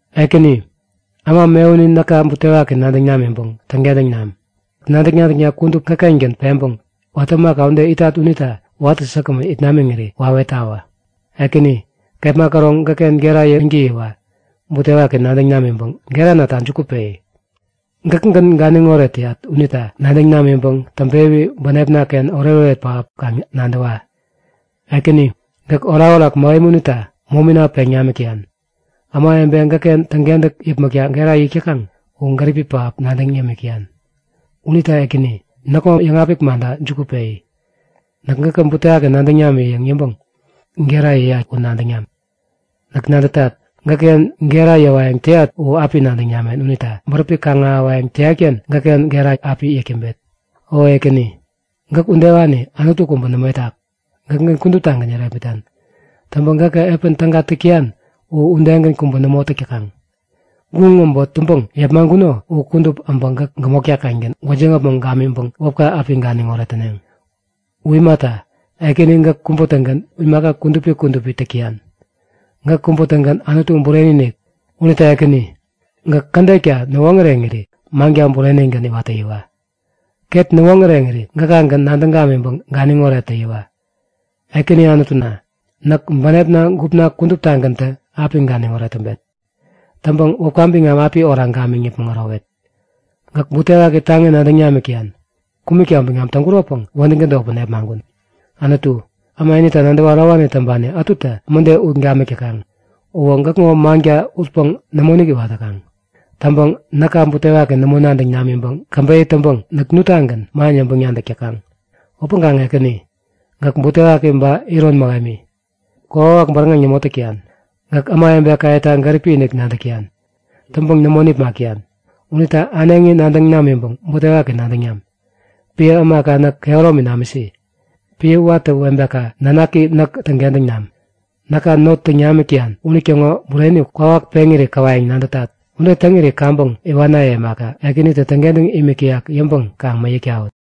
Ekäni, äma mewuni näka butewaki nadäŋ namiŋpäŋ täŋkentäŋ nam! Nadäk-nadäkna kudup gäkkengän peŋpäŋ watä epän ämaka ude itat unita watä säkgämän it namiŋiri wawetawä. Ekäni, kepma käroŋ gäkken gera yäŋtäyiwa butewaki nadäŋ namiŋpäŋ geranata juku peyi. Gäkgän ganiŋoret täyat unita nadäŋ namiŋpäŋ täŋpewi bänepnaken oretoret pähap kaŋ nadäwa. Ekäni, gäk orakorak mähemi unita mominin peŋ nimik täyan. Ämawebe gäkken täŋkentäk yäpmäkta gera yäk täkaŋ u gäripi pähap nadäŋ yämik täyan. Unita Ekäni, näkŋo yäŋapik manta juku peyi. Näk gäkä butewaki nadäŋ nami yäŋ yäŋpäŋ gera yäyat u nadäŋ nam. Näk nadätat, gäkken gera yäwayäŋ täyat u api nadäŋ namen unita bäräpi kaŋ-ahäwayäŋ täyatken gäkken gera api yäk täŋpet. O Ekäni, gäk udewani Anutu kubä nämo itak. Gäkägän kuduptagän yärepmitan. Täŋpäŋ gäkä epän täga täk täyan u udegän kubä nämo täk täkaŋ. Guŋ äbot täŋpäŋ yepmaŋkuno u kudup abä gäk gämotkaken gwäjiŋ äpmoŋ gamiŋpäŋ wäpka api ganiŋoret täneŋ. U imata, Ekäni gäk kubä-tägän imaka kudupi kudupi täk täyan. Gäk kubä-tägän Anutu bureni-inik. Unita Ekäni, gäk kädetka näwoŋäreŋiri manka burenigän iwat täyiwa! Ket näwoŋäreŋiri gäkagän nadäŋ gamiŋpäŋ ganiŋoret täyiwa! Ekäni Anutuna, näk bänepna gupna kuduptagäntä api ganiŋoret täŋpet. Täŋpäŋ wäpka biŋam api oraŋ gamiŋ yäpmäŋ ärowet. Gäk butewaki taŋi nadäŋ namik täyan. Kumäkta biŋam täŋkuropäŋ wädäŋ tädotpäŋ nepmaŋkun. Anutu, äma inita nadäwä ärowani täŋpani ätutä mäde ut namik täkaŋ. Uwä gäkŋo manka utpäŋ nämoinik iwat täkaŋ. Täŋpäŋ näka butewaki nämo nadäŋ namiŋpäŋ käbeyä täŋpäŋ näk nuttagän man yäŋpäŋ-nadäk täkaŋ. Upäŋkaŋ Ekäni, gäk butewaki ba iron mähemi, kokwawak bäräŋeŋ nämo täk täyan. Gäk ämawebekayeta gäripi-inik nadäk täyan. Täŋpäŋ nämo nipmak täyan. Unita äneŋi nadäŋ namiŋpäŋ butewaki nadäŋ nam. Piä ämaka näk kehäromi namisi. Piä watä webeka nanaki näk täŋkentäŋ nami! Näka not täŋ namik täyan unitäŋo bureni kwawak peŋiri käwayäŋ nadätat. Ude täŋiri kaŋpäŋ iwanaye imaka, Ekänitä täŋkentäŋ imik täyak yäŋpäŋ kaŋ mäyäk tawut!